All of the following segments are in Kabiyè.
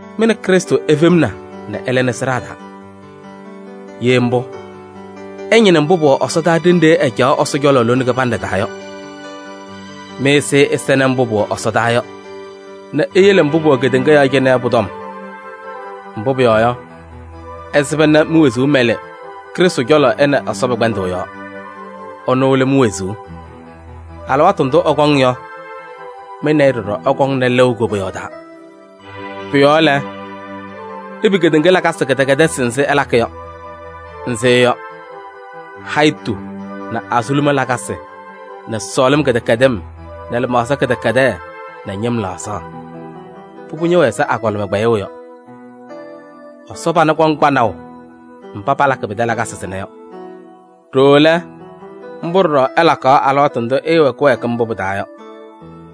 Mɩ nɛ Krɩstʋ ifemna nɛ ɩlɩnɩ sɩɖaa taa. Ye mbʋ, ɩñɩnɩ mbʋ pʋwɛ ɛsɔdaa ɖenɖe ɛcaɣ Ɛsɔ cɔlɔ lone kɩbanɖɛ taa yɔ. Mɩ-ɛzɩyɛ ɛsɛnɩ mbʋ pʋwɛ ɛsɔdaa yɔ nɛ iyele mbʋ pʋwɛ kedeŋa yɔɔ cɩnɛ yɔ pʋ-tɔm. Mbʋ pʋyɔɔ yɔ, ɩsɩba nɛ mi-wezuu mɛlɩ Krɩstʋ cɔlɔ ɛ nɛ Ɛsɔ pɛ-kpɛndʋʋ yɔɔ. Ɛnʋ lɛ mi-wezuu. Alɩwaatʋ ndʋ ɛkɔŋ yɔ, mɩ nɛ ɩ ɖɔɖɔ ɩkɔŋnɩ lɩʋ koboyaɣ taa. Pʋ-yɔɔ lɛ, ipi kedeŋa lakasɩ kɩdɛkɛdɩsɩ nzɩ ɩlakɩ yɔ. Nzɩ yɔ: hayitu nɛ azuluma lakasɩ nɛ sɔɔlɩm kɩdɛkɛdɩm nɛ lɩmaɣza kɩdɛkɛdɛɛ nɛ ñɩm laɣzaɣ. Pʋbʋ ñɛwɛ ɛzɩ agɔlɩma kpɛyʋʋ yɔ. Ɛsɔ pana kɔŋ kpanaʋ mba palakɩ pɩtɛ lakasɩ sɩnɛ yɔ. Ɖooo lɛ, mbʋ ɖɔɖɔ ɩlakaɣ alɩwaatʋ ndʋ ɩɩwɛ kɩwɛɛkɩm mbʋ pɩ-taa yɔ.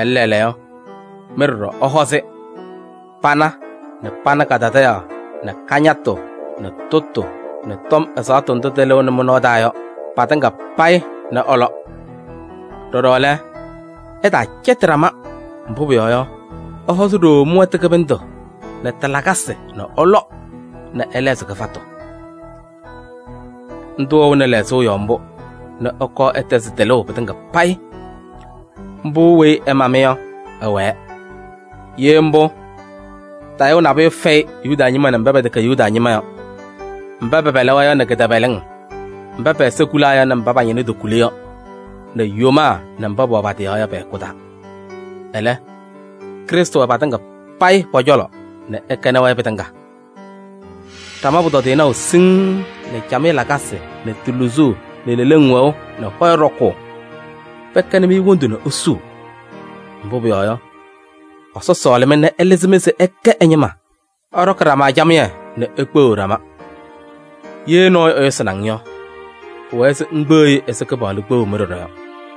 Ɛlɛ lɛɛlɛɛyɔ, mɩ ɖɔɖɔ ɩhɔzɩ: pana nɛ pana kadadaɣyaɣ nɛ kañatʋ nɛ tʋtʋ nɛ tɔm ɛzaɣtʋ ndʋ tɩlɩɣnɩ mɩ-nɔɔ taa yɔ patɩŋa payɩ nɛ ɩlɔ. Ɖɔɖɔ lɛ, ɩtaacɛtɩ ɖama, mbʋ pʋyɔɔ yɔ, ɩhɔzɩ ɖooo mɩ-wɛtʋ kɩbɩndʋ nɛ tɩ-lakasɩ nɛ ɩlɔ nɛ ɩlɛɣzɩ kɩfatʋ. Ndʋ wɛɣnɩ lɛɣzʋʋ yɔɔ mbʋ nɛ ɩkɔɔ ɩtɛzɩ tɩlʋʋ pɩtɩŋa payɩ. Mbʋ weyi ɛma-mɩ yɔ, ɛwɛɛ. Ye mbʋ, tayʋʋ nabʋyʋ fɛyɩ Yuda ñɩma nɛ mba pɛtɛkɛ Yuda ñɩma yɔ, mba pɛpɛlɩ-wɛ yɔ nɛ kɩtɛpɛlɩŋ, mba pɛ-ɛza kulaa yɔ nɛ mba pa-ñɩna tokuli yɔ, nɛ yomaa nɛ mba pɛwɛ pa-tɩ yɔɔ yɔ pɛ-hɛkʋ taa. Ɛlɛ, Krɩstʋ wɛ patɩŋa payɩ pɔ-cɔlɔ nɛ ɛkɛnɩ-wɛ pɩtɩŋa. Ɖama pʋtɔdɩyɛ naʋ siŋŋ nɛ camɩyɛ lakasɩ nɛ tɩ luzuu nɛ leleŋ wɛʋ nɛ hɔyɛ ɖɔkʋʋ, pɛkɛnɩ-mɩ wondu nɛ isuu. Mbʋ pʋyɔɔ yɔ, Ɛsɔ sɔɔlɩ-mɩ nɛ ɛlɩzɩ-mɩ se ɩkɛ ɛ-ñɩma. Ɩɖɔkɩ ɖama camɩyɛ nɛ ikpeɣiɣ ɖama. Ye nɔɔyʋ ɛyʋsɩnɩ-ŋ yɔ, pʋwɛɛ se ŋkpeɣ-i ɛzɩ Kɩpaɣlʋ kpeɣu-mɩ ɖɔɖɔ yɔ.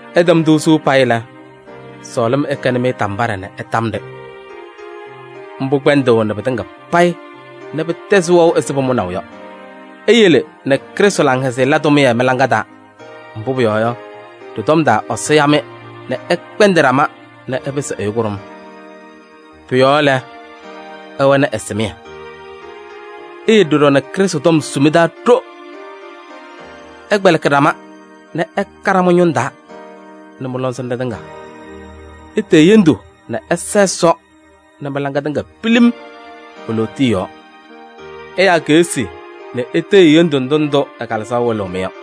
Ɩtɛm-tʋ suu payɩ lɛ, sɔɔlɩm ɛkɛnɩ-mɩ tambaɖɛ nɛ ɩtam-ɖɩ: mbʋ kpɛndɩɣnɩ pɩtɩŋa payɩ nɛ pɩtɛzɩ wɛʋ ɛzɩ pʋmʋnaʋ yɔ. Iyele nɛ Krɩstʋ laŋhɛzɩyɛ la tʋmɩyɛ mɩ-laŋa taa, mbʋ pʋyɔɔ yɔ, ɖɩ-tɔm taa Ɛsɔ ya-mɩ nɛ ɩkpɛndɩ ɖama nɛ ɩpɩsɩ ɛyʋ kʋɖʋm. Pʋ-yɔɔ lɛ, ɩwɛnɩ ɛsɩmɩyɛ. Iyele ɖɔɖɔ nɛ Krɩstʋ tɔm su mɩ-taa ɖo: ɩkpɛlɩkɩ ɖama nɛ ɩka ɖama ñʋŋ taa nɛ mɩ-lɔŋsɩnɖɛ tɩŋa. Itee hendu nɛ ɩsa Ɛsɔ nɛ mɩ-laŋɩyɛ tɩŋa pilim e-lootiye yɔɔ: ɩyaa keɣsi nɛ itee-i hendu ndʋ ndʋ ɛ-Kalɩzaɣ wɩlɩɣ-mɩ yɔ.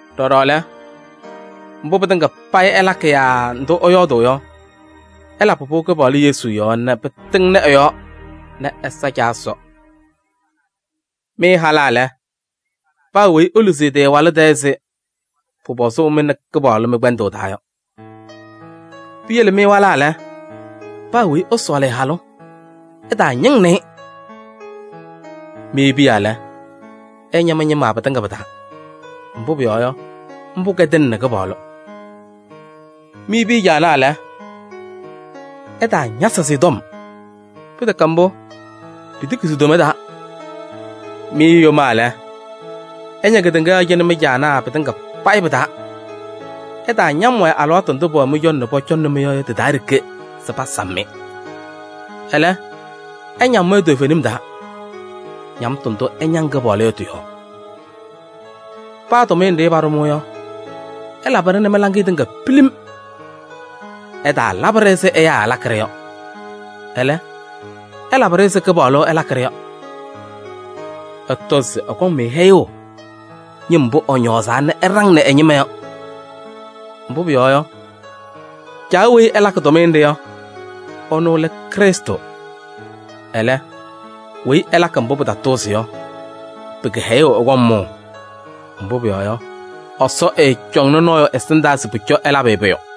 Ɖɔɖɔ lɛ, mbʋ pɩtɩŋa payɩ ɩlakɩ yaa ndʋ ɩyɔɔdʋʋ yɔ, ɩlabɩ-pʋ Kɩpaɣlʋ Yesu yɔɔ nɛ pɩtɩŋnɩ ɛ-yɔɔ nɛ ɩsa Caa Ɛsɔ. Mɩ halaa lɛ, paa weyi eluzi ɛ-tɩ ɛ-walʋ tɛɛ ɛzɩ pʋpɔzʋʋ mɩ nɛ Kɩpaɣlʋ mɩ-kpɛndʋʋ taa yɔ. Piyele mɩ walaa lɛ, paa weyi ɛsɔɔlɩ ɛ-halʋ, ɛtaañɩŋnɩ-ɩ. Mɩ piya lɛ, ɩña mɩ-ñɩma pɩtɩŋa pɩ-taa, mbʋ pʋyɔɔ yɔ, mbʋ kɛdɩnɩnɩ Kɩpaɣlʋ. Mɩ piya caanaa lɛ, ɩtaañasɩ-sɩ tɔm, pɩtɛkɛ mbʋ, pitiki si-toma taa. Mɩ yomaa lɛ, ɩña kedeŋa yɔɔ cɩnɛ mɩ-caanaa pɩtɩŋa payɩ pɩ-taa. Ɩtaañam-wɛ alɩwaatʋ ndʋ pɛwɛ mɩ-cɔlɔ nɛ pɔcɔŋnɩ-mɩ yɔ tɩ-taa ɖeke se pasam-mɩ. Ɛlɛ, ɩñam-wɛ toovenim taa, ñamtʋ ndʋ ɩñaŋ Kɩpaɣlʋ yɔ tɩ-yɔɔ. Paa tʋmɩyɛ nɖɩ paɖʋ-mɩ yɔ, ɩlabɩ-ɖɩ nɛ mɩ-laŋɩyɛ tɩŋa pilim. Ɩtaalabɩ-ɖɩ ɛzɩ ɛyaa ɩlakɩ-ɖɩ yɔ, ɛlɛ, ɩlabɩ-ɖɩ ɛzɩ Kɩpaɣlʋ ɩlakɩ-ɖɩ yɔ. Ɩtɔzɩ se ɛkɔŋ-mɩ hɛyʋʋ ñɩm mbʋ ɛñɔɔzaa nɛ ɛɖaŋnɩ ɛ-ñɩma yɔ. Mbʋ pʋyɔɔ yɔ, Caa weyi ɩlakɩ tʋmɩyɛ nɖɩ yɔ, ɛnʋ lɛ Krɩstʋ. Ɛlɛ, weyi ɛlakɩ mbʋ pɩtatʋʋzɩ yɔ, pɩ-kɩhɛyʋʋ ɛkɔŋ mʋʋ, mbʋ pʋyɔɔ yɔ, Ɛsɔ ɛɛcɔŋnɩ nɔɔyʋ ɛsɩndaa se pʋcɔ ɛlabɩ-ɩ pʋyʋ.